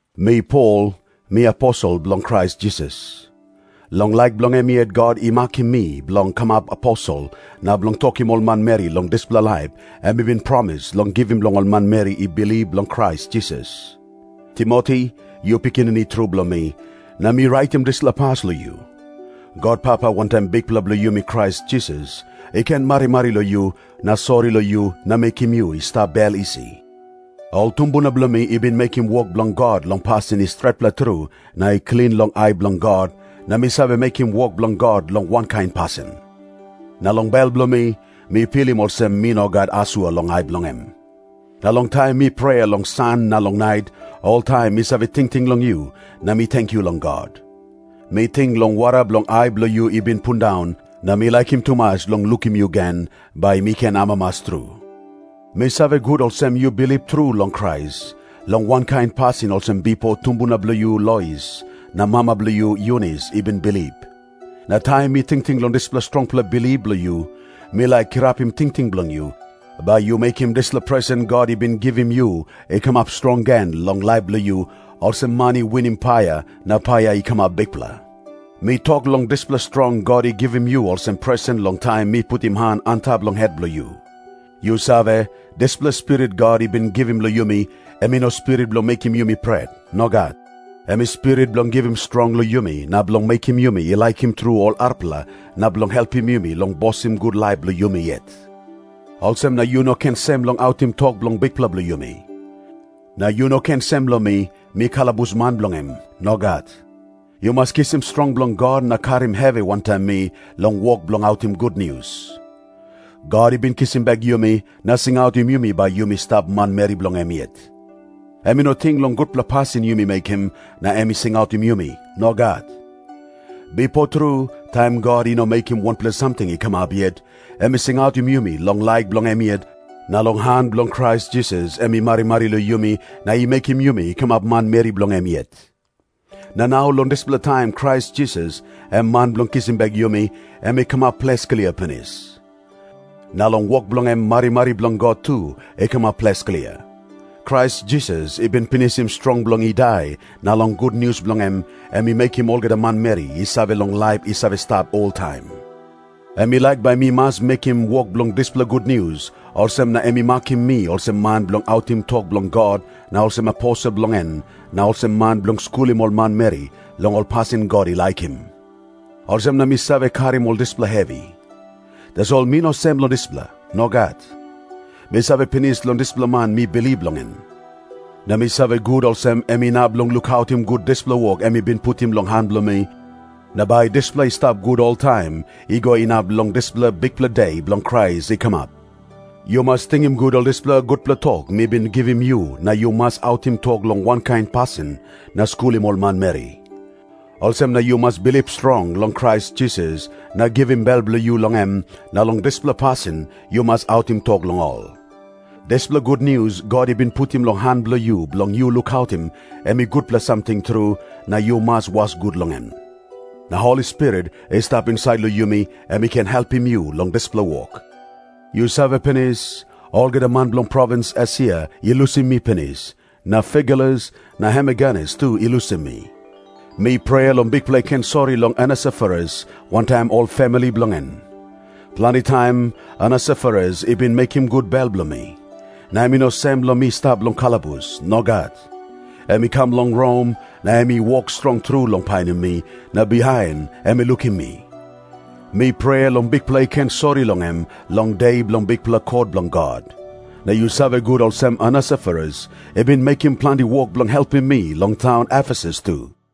Mi Pol, mi aposel bilong Krais Jisas. Long laik bilong em yet God i makim mi bilong kamap aposel na bilong tokim ol manmeri long dispela laip em i bin promis long givim long ol manmeri i bilip long Krais Jisas. Timoti, yu pikinini tru bilong mi, na mi raitim dispela pas long yu. God Papa wantaim Bikpela bilong yumi Krais Jisas, i ken marimari long yu na sori long yu na mekim yu i stap bel isi. Ol tumbuna bilong mi i bin mekim wok bilong God long pasin i stretpela tru na i klin long ai bilong God, na mi save mekim wok bilong God long wankain pasin. Na long bel bilong mi, mi pilim olsem mi no gat asua long ai bilong em. Na long taim mi prea long san na long nait, oltaim mi save tingting long yu na mi tenkyu long God. Mi ting long wara bilong ai bilong yu i bin pundaun, na mi laikim tumas long lukim yu gen, bai mi ken amamas tru. Mi save gut olsem yu bilip tru long Krais, long wankain pasin olsem bipo tumbuna bilong yu Lois na mama bilong yu Yunis i bin bilip. Na taim mi tingting long dispela strongpela bilip bilong yu, mi laik kirapim tingting bilong yu, bai yu mekim dispela presen God i bin givim yu i kamap strong gen long laip bilong yu, olsem man i winim paia na paia i kamap bikpela. Mi tok long dispela strong God i givim yu olsem presen long taim mi putim han antap long het bilong yu. Yu save, dispela Spirit God i bin givim long yumi, em i no spirit bilong mekim yumi i pret. Nogat. Em i Spirit bilong givim strong long yumi na bilong mekim yumi i laikim tru ol arapela na bilong helpim yumi long bosim gut laip bilong yumi yet. Olsem na yu no ken sem long autim tok bilong Bikpela bilong yumi. Na yu no ken sem long mi, mi kalabusman bilong em. Nogat. Yu mas kisim strong bilong God na karim hevi wantaim mi long wok bilong autim gutnius. God i bin kisim bek yumi na singautim yumi bai yumi stap manmeri bilong em yet. Em i no ting long gutpela pasin yumi mekim na em i singautim yumi. Nogat. Bipo tru, taim God i no mekim wanpela samting i kamap yet, em i singautim yumi long laik bilong em yet, na long han bilong Krais Jisas em i marimari long yumi na i mekim yumi i kamap manmeri bilong em yet. Na nau long dispela taim Krais Jisas, em Man bilong kisim bek yumi, em i kamap ples klia pinis. Na long wok bilong em marimari bilong God tu i kamap ples klia. Krais Jisas i bin pinisim strong bilong i dai, na long gutnius bilong em, em i mekim olgeta manmeri i save long laip i save stap oltaim. Em i laik bai mi mas mekim wok bilong dispela gutnius, olsem na em i makim mi olsem man bilong autim tok bilong God na olsem aposel bilong en na olsem man bilong skulim ol manmeri long ol pasin God i laikim. Olsem na mi save karim ol dispela hevi. Tasol mi no sem long dispela. Nogat. Mi save pinis long dispela man mi bilip long en. Na mi save gut olsem em inap long lukautim gut dispela wok em i bin putim long han bilong mi, na bai dispela i stap gut oltaim, i go inap long dispela bikpela De bilong Krais i kamap. Yu mas tingim gut ol dispela gutpela tok mi bin givim yu na yu mas autim tok long wankain pasin na skulim ol manmeri. Olsem na yu mas bilip strong long Krais Jisas na givim bel bilong yu long em, na long dispela pasin yu mas autim tok long ol. Dispela gutnius God i bin putim long han bilong yu bilong yu lukautim, em i gutpela samting tru, na yu mas was gut long en. Na Holi Spirit i stap insait long yumi, em i ken helpim yu long dispela wok. Yu save pinis, olgeta man bilong provins Esia i lusim mi pinis, na Figelus na Hermogenes tu i lusim mi. Mi prea long Bikpela i ken sori long Onesiforus wantaim ol famili bilong en. Planti taim Onesiforus i bin mekim gut bel bilong mi. Na em i no sem long mi stap long kalabus. Nogat. Em i kam long Rom na em i wok strong tru long painim mi, na bihain em i lukim mi. Mi prea long Bikpela i ken sori long em long De bilong bikpela kot bilong God. Na yu save gut olsem Onesiforus i bin mekim planti wok bilong helpim mi long taun Efesus tu.